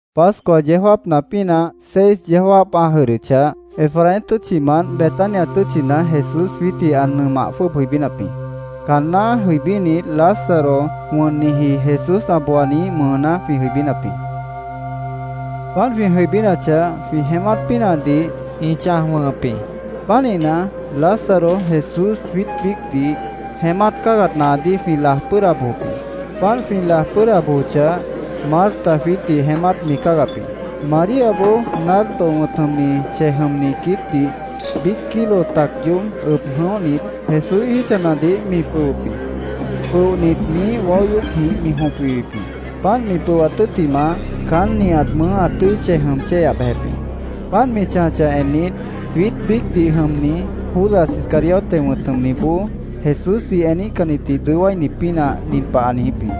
Pascua yeó jáapna pínah seis yeó jáap ã jʉdhdʉchah, Efraín tʉ́tchimant Betania tʉ́tchina Jesús jwiítdih ã nʉmah jwʉ́ʉb jʉibínap jĩ. Caanná jʉibínit, Lázaro wʉnniji, Jesús ã booaniíh mʉʉná jwĩ jʉibínap jĩ. Páant jwĩ jʉibínachah, jwĩ jeémát pínahdih ĩ chãj wʉ̃hʉp jĩ. Pánihna, Lázaro, Jesús, jwiít biícdih jeémát cáagat naadíh jwĩ laj pʉ́ʉda bojop jĩ. Páant jwĩ laj pʉ́ʉda bojochah, Marta jwiítdih jeémát mi cáagap jĩ. Maríaboó nardo wʉ̃t jʉmni chej jʉmni quiítdih, biíc kilo tac yoób ʉb jʉ̃óhnit, Jesúíh jítchanadih mi pʉhwʉp jĩ. Pʉohnit, miíh waó yoócjĩh mi jõp wiwip jĩ. Páant mi pʉhwat tʉ́ttimah, caán nihat mʉʉ́ ã tʉ́i chej jʉm chéyah bejep jĩ. Páant mi chãjachah ennit, jwiít biícdih jʉmni Judas Iscariote wʉ̃t jʉmniboó, Jesúsdih eníhcannitdih dʉó wáini pínah, nin pah ã niijíp jĩ: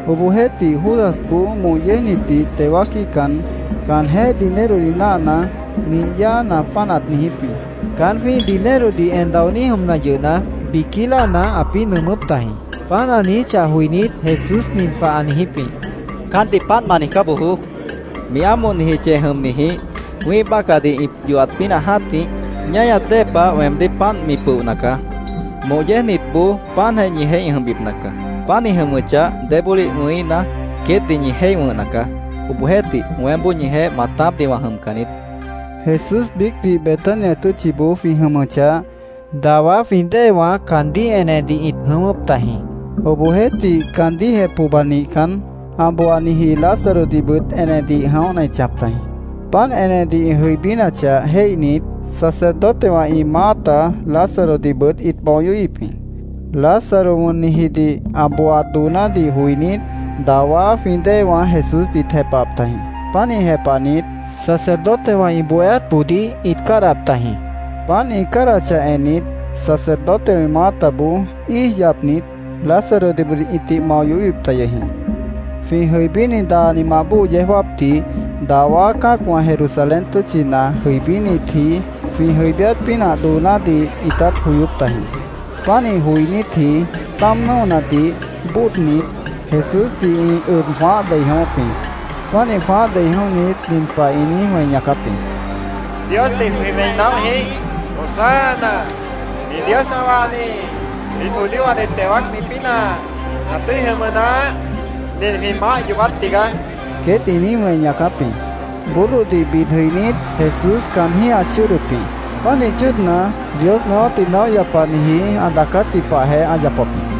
Obohjeéhtih, Judasboó moh yéejnitdih teo wáaquíhcan, caanjéh dinerodih náahna, nih yáana, páant ãt niijíp jĩ. Caán jwĩ́ih dinerodih en daoní jʉmna yʉhna, biquí láana ãpĩ́ nʉʉmʉ́p tajĩ. Páant ã niijíchah joinít, Jesús nin pah ã niijíp jĩ: —Caántdih páant ma niijcá bojoó. Mi ámohniji chej jʉmnijĩh wĩ́ih bácahdih ĩ yohat pínah jã́tih ñáñat dée pah weemdíh páant mi pʉohna caá. Moh yéejnitboó páantjeh ñijeéh ĩ jʉmbipna caá. Páant ĩ jʉmʉchah, débólih wʉ̃híhna, queétdih ñi jéih wʉ̃hna caá.Obohjeéhtih, weémboó ñijeéh maatápdih wã jʉmcan niít, ã niijíp jĩ. Jesús biícdih Betania tʉ́tchiboó jwĩ jʉmʉchah, dawá jwĩ déewã caandíh enedih ĩt jʉ̃ʉ́wʉ́p tajĩ. Obohjeéhtih, caandíhjeh pohba nihcan, ã booaniji Lázarodihbʉt enedih jʉ̃óhna ĩt chãjap tajĩ. Páant enedih ĩ jʉibínachah jéihnit, sacerdotewã ĩ maáta Lázarodihbʉt ĩt mao yohíhip jĩ. Lázaro wʉnnijidih ã booaat doonádih joinít, dawá jwĩ déewã Jesúsdih ĩt jepahap tajĩ. Pánih jepahnit, sacerdotewã ĩ bohéátboodíh ĩt cádahap tajĩ. Páant ĩ cádahachah ennit, sacerdotewã ĩ maátaboó íij yapnit, Lázarodihbʉt ĩtih mao yohíhip ta yʉh jĩ. Jwĩ jʉibíni daanimant bóo yeó jáapdih dawá cã́acwã Jerusalén tʉ́tchina jʉibínitji jwĩ jʉibíát pínah doonádih ĩtát joyóp tajĩ. Pánih joinítji táam nʉ́onadih bóodnit, Jesúsdih ĩ ʉb jwãáh dei jʉ̃ʉ́wʉ́p jĩ. Pánih jwãáh dei jʉ̃óhnit, nin pah ĩ niíj wẽi ñaacáp jĩ: —¡Diosdih jwĩ wẽi naóh jĩíh! ¡Hosana, nin Dios ã wahni jwiít judíowãdih teo wáacni pínah ã tʉ́i jʉmʉ naáh! ¡Nin jwĩ Maáh yoobát tigaá! queét ĩ niíj wẽi ñaacáp jĩ. Burrodih bid jʉinít, Jesús caanjíh ã chʉ́ʉdʉp jĩ. Pánih chʉ́ʉdna, Dios naáwátdih naóh yapaniji ã daacátji pahjeh ã yapap jĩ.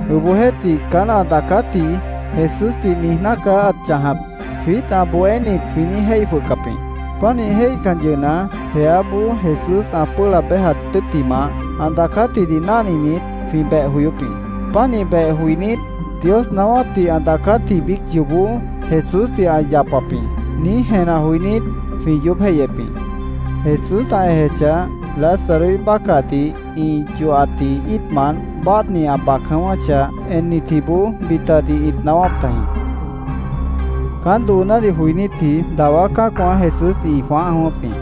Obohjeéhtih, ‘Caán ã daacátji Jesúsdih niijná caá ãt chãjap’, jwiít ã bohénit jwĩ niíj jéih jwʉhcap jĩ. Pánih jéihcan yʉhna, jeáboó Jesús ã pʉ́ʉh laab béjat tʉ́ttimah, ã daacátjidih náhninit, jwĩ beh joyóp jĩ. Pánih beh joinít, “Dios naáwátdih ã daacátji biíc yoobó Jesúsdih ã yapap jĩ”, niíj jenah joinít, jwĩ yoób jéihyep jĩ. Jesús ã ejechah, Lázaroíh bácahdih ĩ yohatji íitmant báadhni ã bac jʉ̃ʉ́wʉ́chah ennitjiboó bitadih ĩt naáwáp tajĩ. Caán doonádih joinítji dawá cã́acwã Jesúsdih ĩ jwãáh jʉ̃ʉ́wʉ́p jĩ.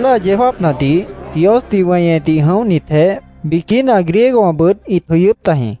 Fiesta yeó jáapnadih Diosdih weñedih jʉ̃óhnitjeéh, biquína griegowãbʉt ĩt jʉyʉ́p tajĩ.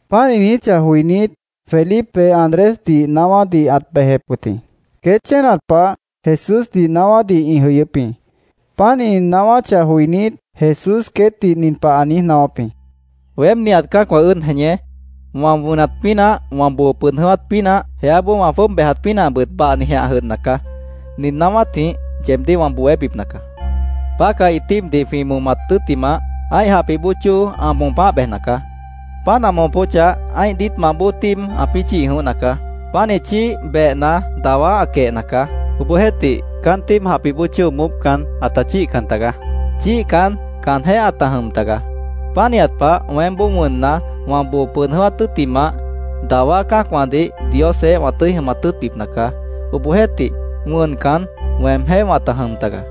Páant ĩ niijíchah joinít, Felipe Andrésdih naáwádih ãt bejep wʉt jĩ. Queét chénat pah Jesúsdih naáwádih ĩ jʉyʉ́p jĩ. Páant ĩ naáwáchah joinít, Jesús queétdih nin pah ã niíj naáwáp jĩ: —Weém nihat cã́acwã ʉ́ʉd jeñé wã wʉnat pínah, wã boo pʉd jʉ̃ʉ́wát pínah, jeáboó wã jwʉ́ʉb bejat pínahbʉt bahnijeh ã jʉdhna caá. Nin naáwátjĩh yeebdíh wã bohébipna caá. Pácahi tíibdih jwĩ momat tʉ́ttimah, ã́ih japih bóo chóo ã moopáh bejna caá. Páant ã moopóchah, ã́ih diítmant bóo tíib ãpĩ́ chíih jʉ̃óhna caá. Pánih chíih, behna, dawá ã quehna caá. Obohjeéhtih, caán tíib moópcan, ãta chíihcan tagaá. Chíihcan, caanjéh ãta jʉm tagaá. Pánihat pah, weémboó wʉnna, wã boo pʉd jʉ̃ʉ́wát tʉ́ttimah, dawá cã́acwãdih Diosjeéh wã tʉ́i jʉmat tʉ́ʉtbipna caá. Obohjeéhtih, wʉncan, weemjéh wãta jʉm tagaá.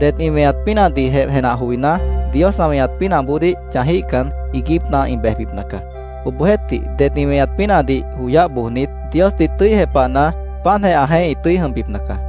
Det ĩ weñat pínahdihjeh jenah joiná, Dios ã weñat pínahboodíh chãjíhcan, iiguípna ĩ bejbipna caá. Obohjeéhtih, det ĩ weñat pínahdih joyáh bojnit, Diosdih tʉ́i jepahna, páantjeh ãjeéh ĩ tʉ́i jʉmbipna caá.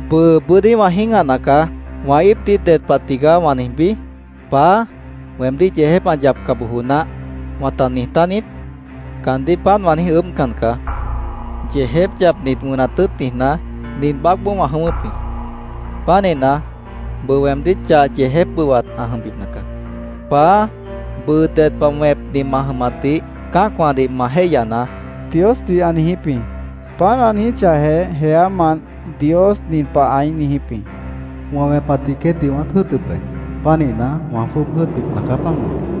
“Bʉʉ bʉ́dí wã jĩ́gahna caá. ¿Wã íipdih ded pah tigaá wã niijbí? ‘Paá, weemdíh yeejép ã yapca bojo naáh’, ¿wãta niij tániít? Caandíh páant wã niíj ʉʉ́bhcan caá. Yeejép yapnit, wʉnat tʉ́ʉt niijná, nin baácboó wã jʉ̃ʉ́wʉ́p jĩ. Pánihna, bʉʉ weemdíh chah yeejép bʉwat ã jʉmbipna caá. Paá, bʉʉ ded pah wẽpni ma jʉmatdih cã́acwãdih ma jéihyanaá”, Diosdih ã niijíp jĩ. Páant ã niijíchahjeh, jeámant Dios nin pah ãí niijíp jĩ: —Wã wẽpatdih queétdih wãát jʉ́ʉtʉp be. Pánihna, wã jwʉ́ʉb jʉ́ʉtbipna caá, páant mʉntih, ã niijíp jĩ.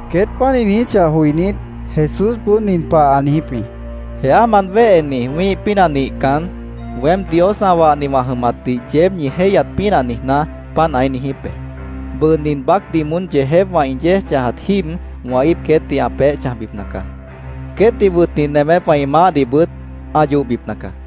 Queét páant ĩ niijíchah joinít, Jesúsboó nin pah ã niijíp jĩ: —Jeámant wéheni wĩ́ih pínah nihcan, weém Dios ã wahni wã jʉmatdih yeéb ñi jéihyat pínah niijná, páant ãí niijíp be. Bʉʉ nin baácdih moón yeejépwã ĩ yéej chãjat jíib wã íip queétdih ã peéh chãjbipna caá. Queétdih wʉtni nemépwã ĩ maáhdihbʉt ã yohbipna caá.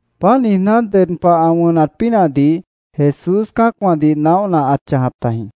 Páant niijná, ded pah ã wʉnat pínahdih Jesús cã́acwãdih naóhna ãt chãjap tajĩ.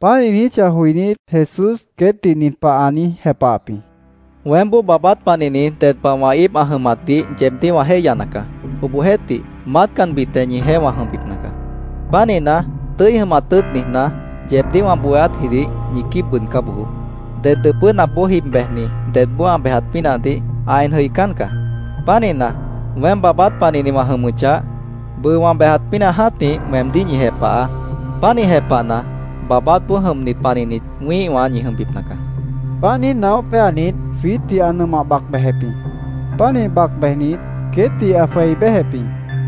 Páant ĩ niijíchah joinít, Jesús queétdih nin pah ã niíj jepahap jĩ: —Weémboó baabát panihni ded pah wã íip ã jʉmatdih yeebdíh wã jéihyana caá. Obohjeéhtih, maátcanbitjeh ñijeéh wã jʉmbipna caá. Pánihna, tʉ́i jʉmat tʉ́ʉt niijná, yeebdíh wã bohéátjidih ñi quíib bʉʉdcá bojoó. Ded dʉpʉ́napboó jib bejni dedboó ã bejat pínahdih ã en jʉicán caá. Pánihna, weém baabát panihni wã jʉmʉchah, bʉʉ wã bejat pínah jã́tih weemdíh ñi jepahaá. Pánih jepahna, baabátboó jʉmnit panihnit wĩ́ihwã ñi jʉmbipna caá, ã niijíp jĩ. Páant niíj naóh péanit, jwiítdih ã nʉmah bac bejep jĩ. Pánih bac bejnit, queétdih ã jwei béjep jĩ.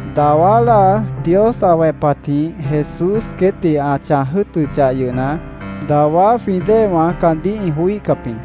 Dawá láa Dios ã wẽpatjĩh Jesús queétdih ã chãj jʉ́ʉtʉchah yʉhna, dawá jwĩ déewã caandíh ĩ joííhcap jĩ.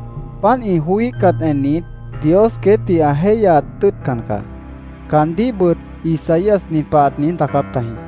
Páant ĩ joííhcat ennit, Dios queétdih ã jéihyat tʉ́ʉtcan caá. Caandíhbʉt Isaías nin pah ãt niíj daacáp tajĩ: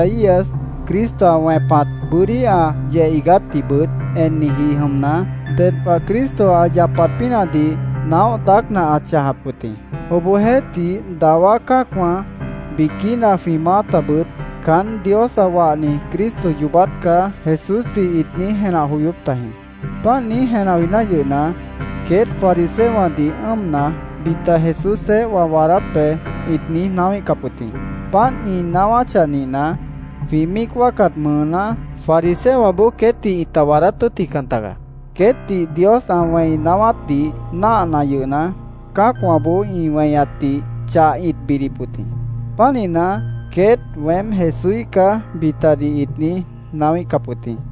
Páant niíj daácna, Isaías Cristo ã wẽpat, bʉ́dí ã yeh iigátdihbʉt enniji jʉmna, ded pah Cristo ã yapat pínahdih naóh daácna ãt chãjap wʉt jĩ. Obohjeéhtih, dawá cã́acwã, biquína jwĩ maátabʉt “Caán Dios ã wahni Cristo yoobát caá”, Jesúsdih ĩt niíj jenah joyóp tajĩ. Páant niíj jenah joiná yʉhna, queét fariseowãdih ʉ́ʉmna, bita “Jesúsjeéh wã waadáp be”, ĩt niíj naáwíhcap wʉt jĩ. Páant ĩ naáwáchah nihna, jwĩ míic wáacat mʉʉná fariseowãboó queétdih ĩta waadát tʉ́ʉtjican tagaá. Queétdih Dios ã wẽi naáwátdih náahna yʉhna, cã́acwãboó ĩ weñatdih chah ĩt bidip wʉt jĩ. Pánihna, queét “Weém Jesúíh caá”, bitadih ĩt niíj naáwíhcap wʉt jĩ.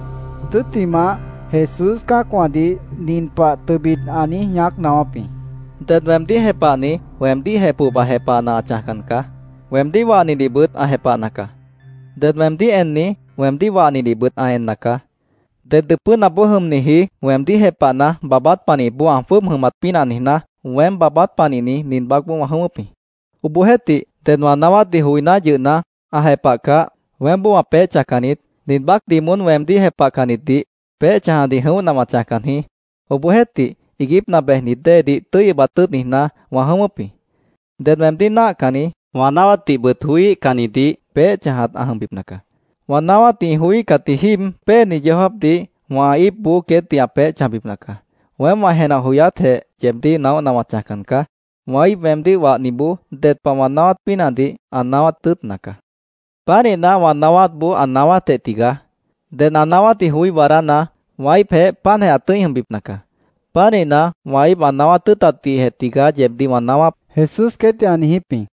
Tʉ́ttimah, Jesús cã́acwãdih nin pah tʉbit ã niíj ñaác naáwáp jĩ: “Ded weemdíh jepahni weemdíhjeh pohba jepahna ã chãjcan caá. Weemdíh wahnidihbʉt ã jepahna caá. Ded weemdíh enni weemdíh wahnidihbʉt ã enna caá. Ded dʉpʉ́napboó jʉmniji, weemdíh jepahna, baabát panihipboó ã jwʉ́ʉb jʉmat pínah niijná, weém baabát panihni nin baácboó wã jʉ̃ʉ́wʉ́p jĩ. Obohjeéhtih, ded wã naáwátdih joiná yʉhna, ã jepahcah, weémboó wã peéh chãjcan niít. Nin baácdih moón weemdíh jepahcannitdih peéh chãjadih jʉ̃óhna wã chãjcan jĩí. Obohjeéhtih, iiguípna bejnit déedih tʉ́i ʉbat tʉ́ʉt niijná, wã jʉ̃ʉ́wʉ́p jĩ. Ded weemdíh náahcanni, wã naáwátdihbʉt joííhcannidih peéh chãjat ã jʉmbipna caá. Wã naáwátdih ĩ joííhcatji jíib péeni yeó jáapdih wã íipboó queétdih ã peéh chãjbipna caá. Weém wã jenah joyátjeh yeebdíh naóhna wã chãjcan caá. Wã íip weemdíh wahniboó ded pah wã naáwát pínahdih ã naáwát tʉ́ʉtna caá. Pánihna, wã naáwátboó ã naáwátjeh tigaá. Ded ã naáwátdih joí waadána, wã íipjeéh páantjeh ã tʉ́i jʉmbipna caá. Pánihna, wã íip ã naáwát tʉ́ʉtatdihjeh tigaá, yeebdíh wã naáwáp”, Jesús queétdih ã niijíp jĩ.